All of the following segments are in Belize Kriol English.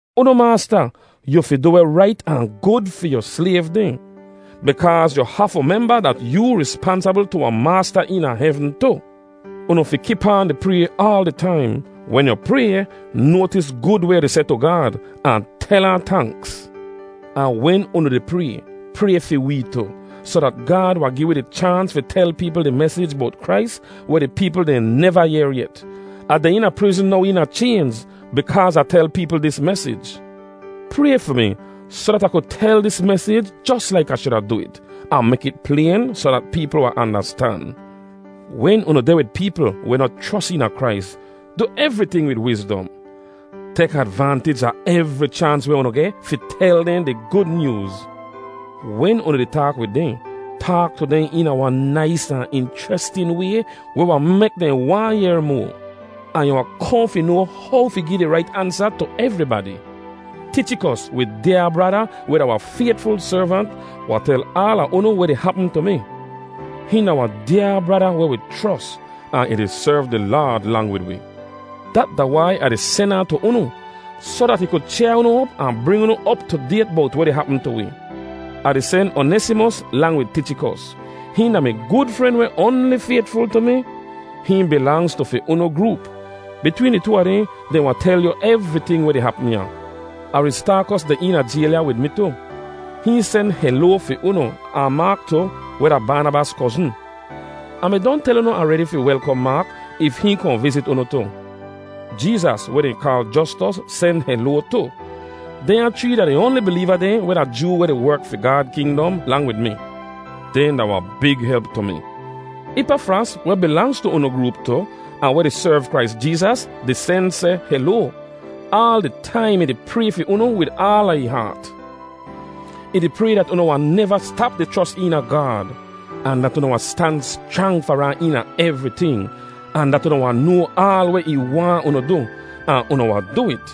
Unu maasta, yu fi du weh rait ahn gud fi yu slayv dehn, bikaaz yu hafu memba dat yoo rispansabl tu wahn Maasta eena hevn tu. Unu fi kip aan di pray aal di taim. Wen yu pray, noatis gud weh yu di seh tu Gaad, ahn tel ahn tanks. Ahn wen unu di pray, pray fi wee tu, soh dat Gaad wahn gi wi di chaans fi tel peepl di mesij bowt Krais weh di peepl dehn neva yehr yet. Ah deh eena prizn now eena chaynz bikaaz Ah tel peepl dis mesij. Pray fi mi, soh dat Ah ku tel dis mesij jos laik Ah shuda du it, ahn mek it playn soh dat peepl wahn andastan. Wen unu deh wid peepl weh noh chros eena Krais, du evriting wid wizdom. Tek advantij a evri chaans weh unu geh, fi tel dehn di Gud Nyooz. Wen unu di taak wid dehn, taak tu dehn eena wahn nais ahn inchrestin way weh wahn mek dehn waahn yehr moa. Ahn yu wahn kohn fi noa how fi gi di rait ansa tu evribadi. Tichikos, wi dyaa brada, weh da wahn faytful servant, wahn tel aala unu weh di hapm tu mi. Hihn da wahn dyaa brada weh wi chros, ahn ih di serv di Laad lang wid wi. Dat da wai Ah di sen ahn tu unu, soh dat ih ku chyaa unu op ahn bring unu op tu dayt bowt weh di hapm tu wi. Ah di sen Onesimos lang wid Tichikos. Hihn da mi gud fren weh oanli faytful tu mi. Hihn bilangz tu fi unu groop. Bitween di too a dehn, dehn wahn tel yu evriting weh di hapm ya. Aristaakos deh eena jayl ya wid mi tu. Hihn sen heloa fi unu, ahn Maak tu, weh da Baanabas kozn. Ah mi don tel unu aredi fi welkom Maak if hihn kohn vizit unu tu. Jeezas, weh dehn kaal Jostos, sen heloa tu. Dehnya chree da di oanli bileeva dehn weh da Joo weh di werk fi Gaad kingdom lang wid mi. Dehn da wahn big help tu mi. Ipafras, weh bilangz tu unu groop tu ahn weh di serv Krais Jeezas, di sen seh heloa. Aal di taim ih di pray fi unu wid aala ih haat. Ih di pray dat unu wahn neva stap di chros eena Gaad, ahn dat unu wahn stan schrang far ahn eena evriting, ahn dat unu wahn noa aal weh ih waahn unu du ahn unu wahn du it.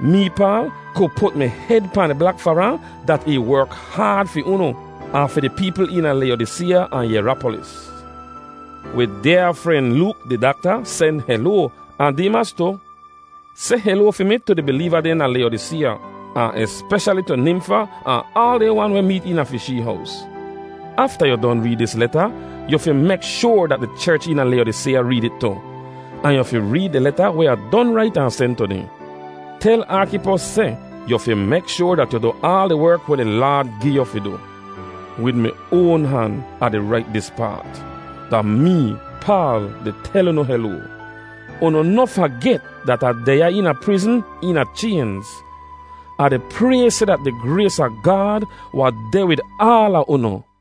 Mee, Paal, ku put mi hed pahn di blak far ahn dat ih werk haad fi unu ahn fi di peepl eena Layodiseeya ahn Yerapolis. Wi dyaa fren Look, di dakta, sen heloa, ahn Deemas tu. Seh heloa fi mi tu di bileeva dehn da Layodiseeya, ahn espeshali tu Nimfa ahn aal dehn wan weh meet eena fi shee hows. Afta yu don reed dis leta, yu fi mek shoar dat di cherch eena Layodiseeya reed it tu. Ahn yu fi reed di leta weh Ah don rait ahn sen tu dehn. Tel Arkipos seh, “Yu fi mek shoar dat yu du aal di werk weh di Laad gi yu fi du.” Wid mi oan han, Ah di rait dis paat: Da mee, Paal, di tel unu heloa. Unu noh faget dat Ah deh ya eena prizn eena chaynz. Ah di pray seh dat di grays a Gaad wahn deh wid aala unu.